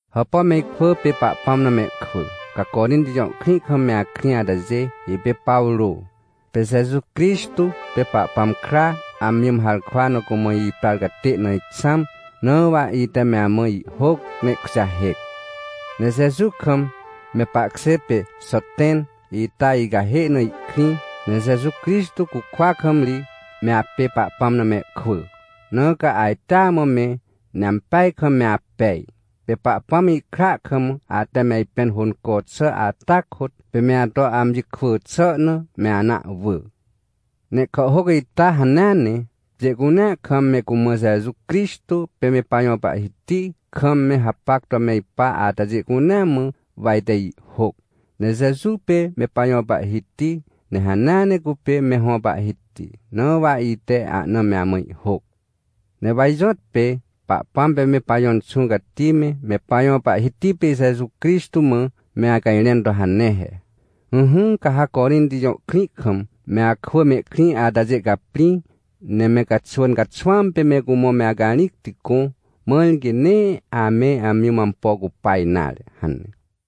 Hàpà me ikwỳ pê Pahpãm na mehkwỳ, ca Corinti jõ krĩ kam me akrĩ atajê. Ipê Pawrô. Pê Jeju Crixtô pê Pahpãm kra amji mã harkwa na cumã iprar catê na ixãm. Na wa ite me amã ihhôc, ne ihkujahêc. Ne Jeju kam me pahkjê pê Xoten ita icahê na ihkrĩ. Ne Jeju Crixtô cukwa kam ri me apê Pahpãm na mehkwỳ, na ca ajtea mã me, ne ampeaj kam me apej. Pê Pahpãm ihkra kam ate me ajpẽn hônco xà ata kôt, pê me ato amji kwỳ xà na, me ana ahwỳ. Ne ihkàhhôc ita hanea ne, pjê cunea kam me cumã Jeju Crixtô pê me pajõ Pahhiti kam me hapac to me ipa atajê cunea mã wa ite ihhôc. Ne Jeju pê me pajõ Pahhiti, ne hanea ne cupê me hõ Pahhiti, na wa ite ahna me amã ihhôc. Ne wa ijõtpê Pahpãm pê me pajõ Inxũ Cati me, me pajõ Pahhiti pê Jeju Crixtô mã, me acajrẽn to hane he: — Ỹhỹ, ca ha Corinti jõ krĩ kam me akwỳ mehkrĩ atajê caprĩ, ne me caxwỳn caxwãm pê me cumã me acarĩcti gõ, mãr quê nee ame amji mã ampo cupa nare — hane.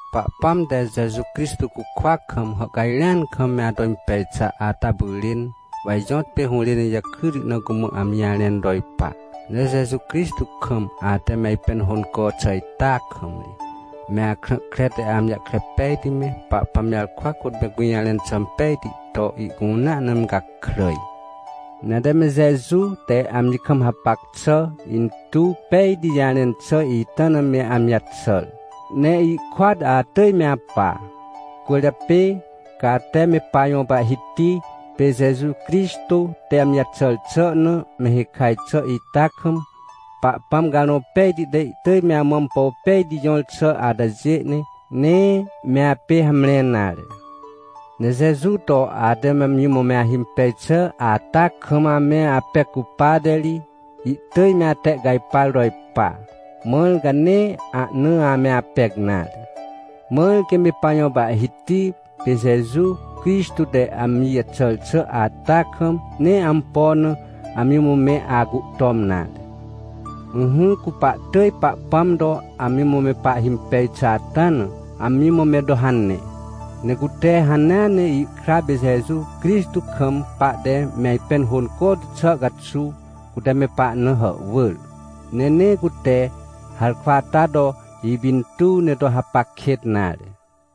Pahpãm te Jeju Crixtô cukwa kam hàhcajrẽan kam me ato impej xà ata pyrên, wa ijõtpê hũrên ijakryti na cumã amji jarẽn to ipa. Ne Jeju Crixtô kam ate me ajpẽn hônco xà ita kam ri, me akrã kre te amji jahkre pejti me, Pahpãm jarkwa kôt me gũjarẽn xà impejti to, ihcunea na me gakràj. Ne ate me Jeju te amji kam hapac xà intuw pejti jarẽn xà ita na me amji caxàr, ne ihkôat atỳj me apa. Cwỳrjapê, ca ate me pajõ Pahhiti pê Jeju Crixtô te amji jaxàr xà na me hikaj xà ita kam, Pahpãm Carõ Pejti te ihtỳj me amã ampo pejti jõr xà atajê, ne nee me apê hamre nare. Ne Jeju to ate amji mã me ahimpej xà ata kam ame apec cupate ri, ihtỳj me atehcajpar to ipa, mãr ca nee ahna ame apec nare. Mãr quê me pajõ Pahhiti pê Jeju Crixtô te amji jaxàr xà ata kam, nee ampo na amji mã me acuhtom nare. Ỹhỹ, cu pahtỳj Pahpãm to amji mã me pahhimpej xà ata na, amji mã me to hane. Ne cute hanea ne ihkra pê Jeju Crixtô kam pahte me ajpẽn hônco tu xà caxuw, cute me pahna hàhwỳr, ne nee cute harkwa ata to ipintuw, ne to hapac kêt nare.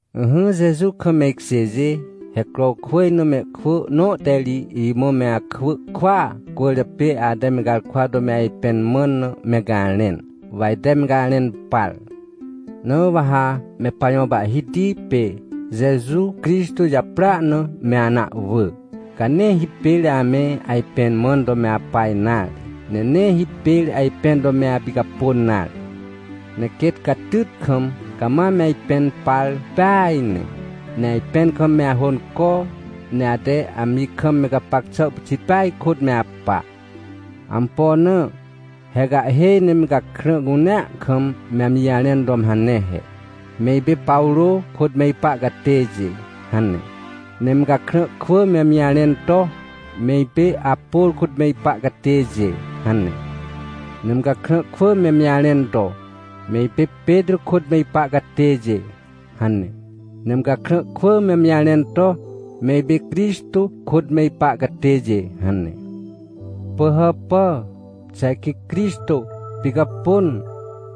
Ỹhỹ Jeju kam me ikjêjê, he Crowkwỳj na mehkwỳ nõ te ri imã me akwỳ kwỳa cwỳrjapê ate me garkwa to me ajpẽn mãn na me garẽn, wa ite me garẽn par. Na wa ha me pajõ Pahhiti pê Jeju Crixtô japrỳa na me ana ahwỳ, ca nee hipêr ame ajpẽn mãn to me apa nare, ne nee hipêr ajpẽn to me apicapôn nare. Ne quêt catyt kam cama me ajpẽn par peaj ne, ne ajpẽn kam me ahônco, ne ate amji kam me gapac xà pyxit peaj kôt me apa. Ampo na? He ca ihhêj ne me gakrã cunea kam me amji jarẽn to me hane he: — Me ipê Pawrô kôt me ipa catêjê — hane. Ne me gakrã kwỳ me amji jarẽn to: — Me ipê Apôr kôt me ipa catêjê — hane. Ne me gakrã kwỳ me amji jarẽn to: — Me ipê Petrô kôt me ipa catêjê — hane. Ne me gakrã kwỳ me amji jarẽn to: — Me ipê Crixtô kôt me ipa catêjê — hane. Pỳhàpà! Xà ajkĩ Crixtô picapôn?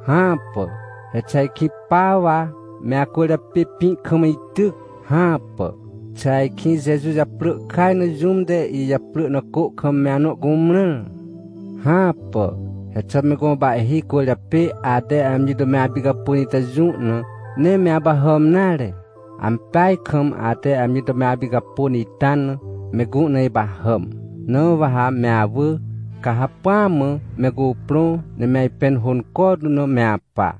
Hãpà! He xà ajkĩ pa wa me acwỳrjapê pĩ kam ityc? Hãpà! Xà ajkĩ Jeju japrỳ kaj na jũm te ijaprỳ na cô kam me anõ cumrãr? Hãpà! He xà me gõ pahhi cwỳrjapê ate amji to me apicapôn ita jũ na, nee me apahàm nare? Ampeaj kam ate amji to me apicapôn ita na, me gũ na ipahàm. Na wa ha me awỳ, ca hacpỹa mã me cuprõ, ne me ajpẽn hônco tu na me apa.